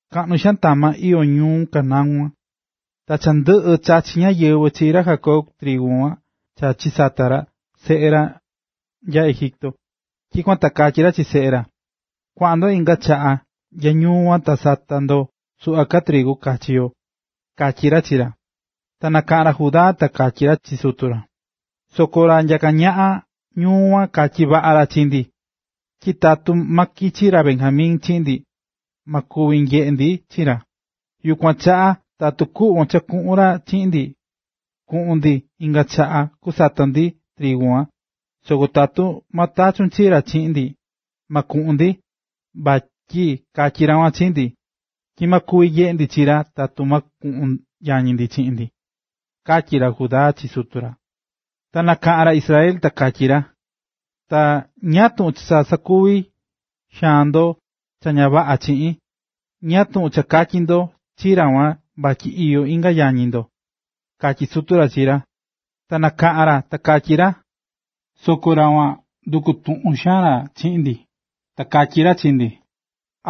Kaꞌnu xaan tama iyó ñuꞌún Canaán kuan. Ta cha ndɨꞌɨ̱ chachi̱ ñáyɨvɨ chi ra Jacob trigu cha chisata̱ seꞌe ra nya Egipto. Tyikuan ta katyí ra chi seꞌe ra: ―Kua̱ꞌan ndo inga chaꞌa nya ñuu kuan ta sata ndo suꞌva ka trigu kachi yo ―katyí ra chi ra. Ta nakaꞌa̱n ra Judá ta katyi̱ ra chi sutu ra: ―Soko ra nyaká ñaꞌan ñuu kuan katyi̱ vaꞌa ra chi ndi, tyi tatu ma kichi ra Benjamin chiꞌin ndi, ma kuvi nyeꞌe ndi chi ra. Yukuan chaꞌa tatu kuꞌvon cha kuꞌun ra chiꞌin ndi, kuꞌun ndi inga chaꞌa kusata ndi trigu. Soko tatu ma tachun chi ra chiꞌin ndi, ma kuꞌun ndi, vatyi katyí ra kuan chi ndi, tyi ma kuvi nyeꞌe ndi chi ra tatu ma kuꞌun yañi ndi chiꞌin ndi ―katyí ra Judá chi sutu ra. Ta nakaꞌa̱n ra Israel ta katyi ra: ―Ta ¿ñáá tuꞌun cha sakuvi̱ xaan ndo cha ña vaꞌa chii? ¿Ñáá tuꞌun katyi̱ ndo chi ra kuan vatyi iyó inga yañi ndo? ―katyí sutu ra chi ra. Ta kanakaꞌa̱n ra, ta kakatyí ra: ―Soko ra kuan nduku̱ tuꞌun xaan ra chi ndi, ta katyí ra chi ndi: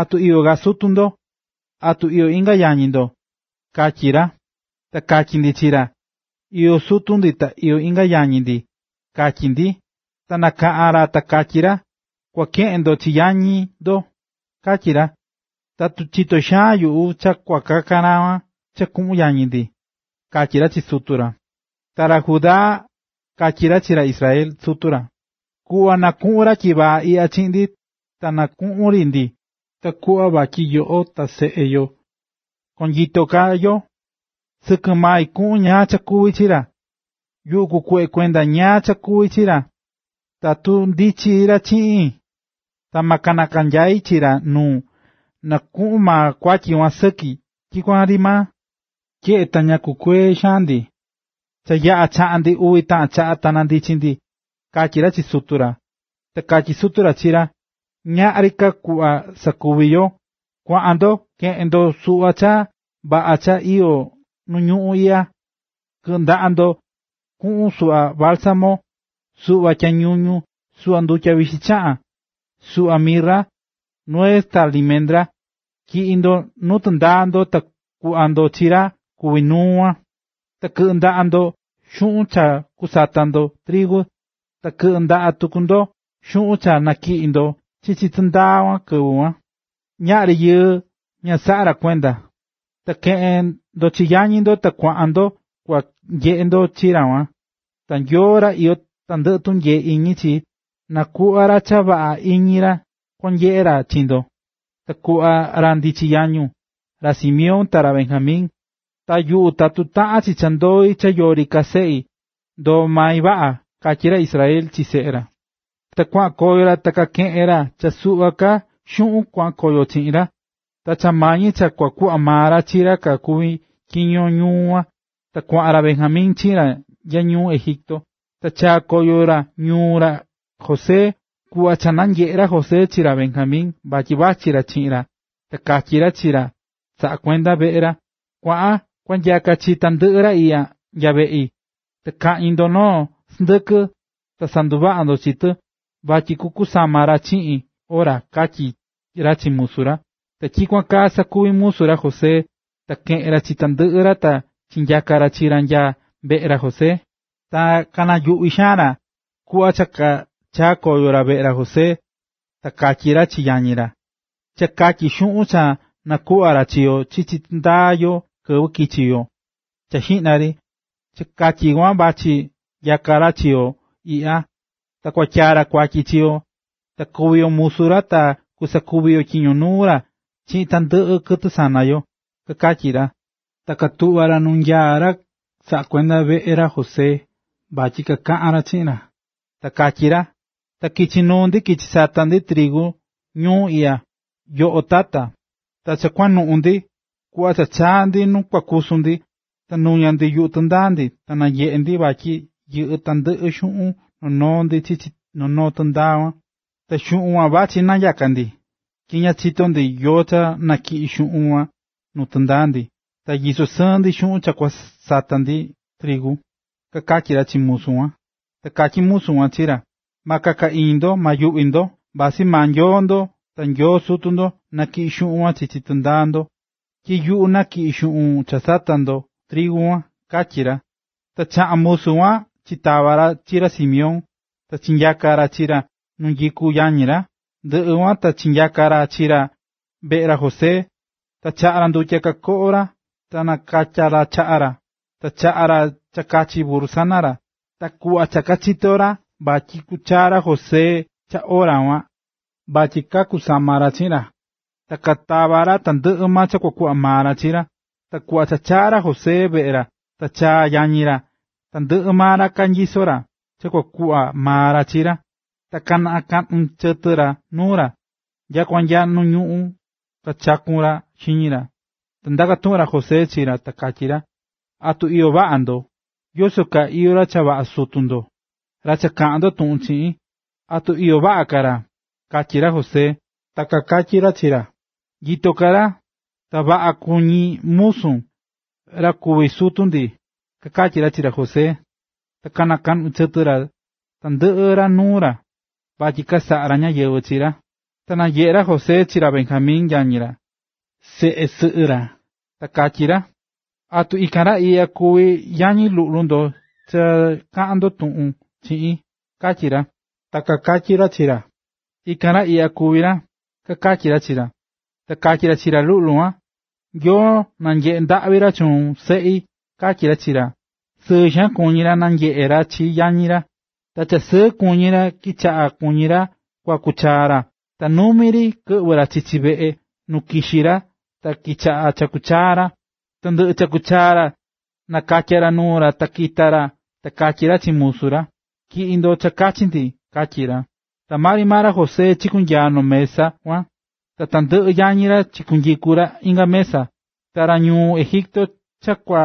“¿Atu iyó ka sutu ndo? ¿Atu iyó inga yañi ndo?”, katyi̱ ra. Ta katyí ndi chi ra: “Iyó sutu ndi ta iyó inga yañi ndi”, katyi̱ ndi. Ta nakaꞌa̱n ra ta katyi̱ ra: “Kua keꞌen ndo chi ra yañi ndo”, katyi̱ ra. ¿Atu chitó xaan nyuꞌu cha kua kakan ra kuan cha kuꞌun yañi ndi? ―kakatyí ra chi sutu ra. Ta ra Judá katyí ra chi ra Israel, sutu ra: ―Ku̱ꞌva na kuꞌun ra tyivaa iꞌya chiꞌin, ta na kuꞌun ri ndi takuꞌva vatyi yoꞌo ta seꞌe yo koo nyito ka yo. Sɨkɨ mai kuꞌun ñáá cha kuvi chi ra, yuꞌu kukuꞌva kuende ñáá cha kuvi chi ra. Tatu ma ndichi ra chiꞌin, ta ma kananyai chi ra nuun, na kuꞌun maa kuatyi kuan sɨki tyikuan ri maa. Tyeꞌe ta ña kukuee̱ xaan ndi, cha yaꞌa̱ chaꞌa̱n ndi uvi taꞌan chaꞌa ta nandichi̱ ndi ―katyí ra chi sutu ra. Ta katyí sutu ra chi ra: ―Ñaꞌri ka kuꞌva sakuvi yo. Kua̱ꞌan ndo. Ke̱ꞌen ndo suꞌva cha vaꞌa ka cha iyó nu ñuꞌún iꞌya, kɨꞌɨ ndaꞌa ndo kuꞌun suꞌva bálsamo, suꞌva tyañuñu, suꞌva ndutya vixi chaꞌán, suꞌva mirra, nuez ta limendra, tyi̱ꞌi ndo nuu tɨndaa ndo ta kuꞌva ndo chi ra kuví nuu kuan. Ta kɨꞌɨ ndaꞌa ndo xuꞌun cha kusata ndo trigu, ta kɨꞌɨ ndaꞌa tuku ndo xuꞌun cha nañiꞌi̱n ndo chichi tɨndaa ndo kɨvɨ kuan, ñaꞌri yɨɨ ña saꞌa̱ ra kuenda. Ta ke̱ꞌen ndo chi yañi ndo ta kuaꞌan ndo kua nyeꞌe ndo chi ra kuan. Ta Nyoo, ra iyó tandɨꞌɨ tunyee iñi chi, na kuꞌva ra cha vaꞌa iñi ra kuan nyeꞌe ra chi ndo, ta kuꞌva ra ndichi yañun, ra Simeón, ta ra Benjamin. Ta yuꞌu tatu taꞌan chi cha ndoi cha yori ka seꞌi, ndoo mai vaꞌa ―katyí ra Israel chi seꞌe ra. Ta kuaꞌan koyo ra ta kakeꞌe̱n ra cha suꞌva ka xuꞌun kuaꞌan chiꞌin ra, ta cha mañi cha kua kuꞌva maa ra chi ra kuví tyiño ñuu kuan, ta kuaꞌan ra Benjamin chiꞌin ra nya ñuu Egipto. Ta chaa̱ koyo ra nuu ra José. Kuꞌva cha nanyeꞌe̱ ra José chi ra Benjamin vatyi vachí ra chiꞌin ra, ta katyí ra chi ra cha saꞌá kuenda veꞌe ra: ―Kua̱ꞌan kua nyaka chi tandɨꞌɨ ra iꞌya nya veꞌi, ta kaꞌñi ndo noo sɨndɨkɨ, ta sanduvaꞌa ndo chi tɨ, vatyi kakusama ra chiꞌin ora ―katyí ra chi musu ra. Ta tyikuan kaa sakuvi̱ musu ra José, ta keꞌe̱n ra chi tandɨꞌɨ ra ta chinyaka̱ ra chi ra nya veꞌe ra José. Ta kanayuꞌvi̱ xaan ra, kuꞌva cha chaa̱ koyo ra veꞌe ra José, ta kakatyí ra chi yañi ra: ―Cha katyi xuꞌun cha nakuꞌva̱ ra chi yo chichi tɨndaa yo kɨvɨ kichi̱ yo cha xiꞌna ri, cha katyi kuan vachí nyaka ra chi yo iꞌya, ta kua tyaa ra kuatyi chi yo, ta kua kuvi yo musu ra ta kusakuvi yo tyiño nuu ra chiꞌin tandɨꞌɨ kɨtɨ sana yo ―kakatyí ra. Ta katuꞌva̱ ra nu nyaá ra saꞌá kuenda veꞌe ra José vatyi kakaꞌan ra chiꞌin ra. Ta kakatyí ra: ―Ta kichi̱ nuu ndi kichi̱ sata̱ ndi trigu ñuu iꞌya, yoꞌo tata, ta cha kuanuꞌun ndi, kuꞌva cha chaa̱ ndi nu kua kusu ndi, ta nuña̱ ndi yuꞌu tɨndaa ndi, ta nanyeꞌe̱ ndi vatyi yɨꞌɨ́ tandɨꞌɨ xuꞌun noo noo ndi chichi noo noo tɨndaa kuan, ta xuꞌun kuan vachí nanyaká ndi. Tyi ña chitó ndi yóó cha natyiꞌi̱ xuꞌun kuan nuu tɨndaa ndi, ta nyisó sɨɨn ndi xuꞌun cha kuenda cha kua sata ka ndi trigu ―kakatyí ra chi musu kuan. Ta katyí musu kuan chi ra: ―Ma kaka iñi ndo, ta ma nayuꞌvi ndo. Vasɨ maa Nyoo ndo, ta Nyoo sutu ndo, tyiꞌi̱ xuꞌun kuan chichi tɨndaa ndo, tyi yuꞌu nakiꞌi̱n xuꞌun cha sata̱ ndo trigu kuan ―katyí ra. Ta chaꞌa̱n musu kuan chitava̱ ra chi ra Simeón, ta chinyaka̱ ra chi ra nu nyikú yañi ra. Ndɨꞌɨ kuan ta chinyaka̱ ra chi ra veꞌe ra José. Ta chaꞌa̱ ra ndutya kakoꞌo ra ta nakatya ra chaꞌa ra, ta chaꞌa̱ ra cha kachi burru sana ra. Ta kuꞌva cha kachitó ra vatyi kuchaa ra José cha ora kuan vatyi kakusama ra chiꞌin ra, ta katava̱ ra tandɨꞌɨ cha kua kuꞌva maa ra chi ra. Ta kuꞌva cha nachaa̱ ra José veꞌe ra, ta chaꞌa̱ yañi ra tandɨꞌɨ maa cha kanyisó ra, cha kua kuꞌva maa ra chi ra, ta kanakaꞌnu̱ chɨtɨ ra nuu ra. Ta nyakua nya nu ñuꞌún kachaku̱n ra xiñi ra. Ta ndaka̱ tuꞌun ra José chi ra, ta katyí ra: ―¿Atu iyó vaꞌa ndo? ¿Yoso kaa iyó ra cha vaꞌa sutu ndo, ra cha kaꞌa̱n ndo tuꞌun chiꞌin? ¿Atu nyitó ka ra? ―katyí ra José. Ta kakatyí ra chi ra: —Nyito ka ra, ta vaꞌa kuñí musun, ra kuví sutu ndi ―kakatyí ra chi ra José, ta kanakaꞌnu̱ chɨtɨ tandɨꞌɨ ra nuu ra, vatyi kasaꞌa̱ ra ñáyɨvɨ chi ra. Ta nanyeꞌe̱ ra José chi ra Benjamin yañi ra, seꞌe sɨꞌɨ ra, ta katyí ra: ―¿Atu ikan ra iꞌya kuví yañi luꞌlu ndo cha kaꞌán ndo tuꞌun chiꞌin? ―katyí ra. Ta kakatyí ra chi ra: ―Ikan ra iꞌya kuví ra ―kakatyí ra chi ra. Ta katyí ra chi ra luꞌlu kuan: ―¡Nyoo nanyeꞌe ndaꞌvi ra chuun, seꞌi! ―katyí ra chi ra. Sɨɨ xaan kuñí ra nanyeꞌe̱ ra chi yañi ra, ta cha sɨɨ kuñí ra kichaꞌa̱ kuñí ra kuaku chaa ra, ta numi ri kɨꞌvɨ̱ ra chichi veꞌe nu kixi ra ta kichaꞌa̱ chakú chaa ra. Ta ndɨꞌɨ chaku̱ chaa ra, ta nakatya̱ ra nuu ra ta kita̱ ra ta katyí ra chi musu ra: “Tyi̱ꞌi ndo cha kachi ndi”, katyí ra. Ta maa ri maa ra José chikunyaa̱ noo mesa kuan, ta tandɨꞌɨ yañi ra chikunyiku̱ ra inga mesa. Ta ra ñuu Egipto cha kua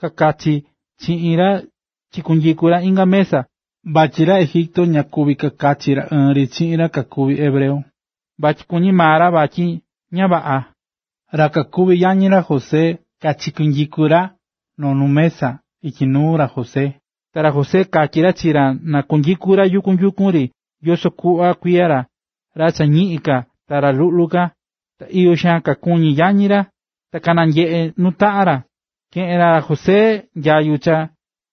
kakachi chiꞌin ra chikunyiku̱ ra inga mesa, vatyi ra Egipto ña kuví kakachi ra ɨɨn ri chiꞌin ra kakuví hebreo, vatyi kuñí maa ra vatyi ña vaꞌa. Ra kakuví yañi ra José kachikunyiku̱ ra noo nu mesa ityi nuu ra José. Ta ra José katyí ra chi ra na kunyiku ra yukun yukun ri yoso kuꞌva kuiya ra, ra cha ñiꞌin ka ta ra luꞌlu ka. Ta iyo xaan kakuñí yañi ra, ta kananyeꞌe̱ nuu taꞌan ra. Keꞌe̱n ra José nyayu cha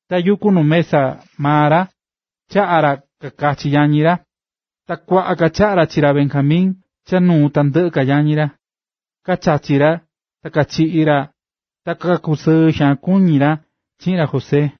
tayukú nu mesa maa ra ta chaꞌa̱ ra kakachi yañi ra, ta kuaꞌa ka chaꞌa̱ ra chi ra Benjamin cha nuu tandɨꞌɨ ka yañi ra. Kachachi̱ ra ta kachiꞌi̱ ra ta kakusɨɨ̱ xaan kakuñi̱ ra chiꞌin ra José.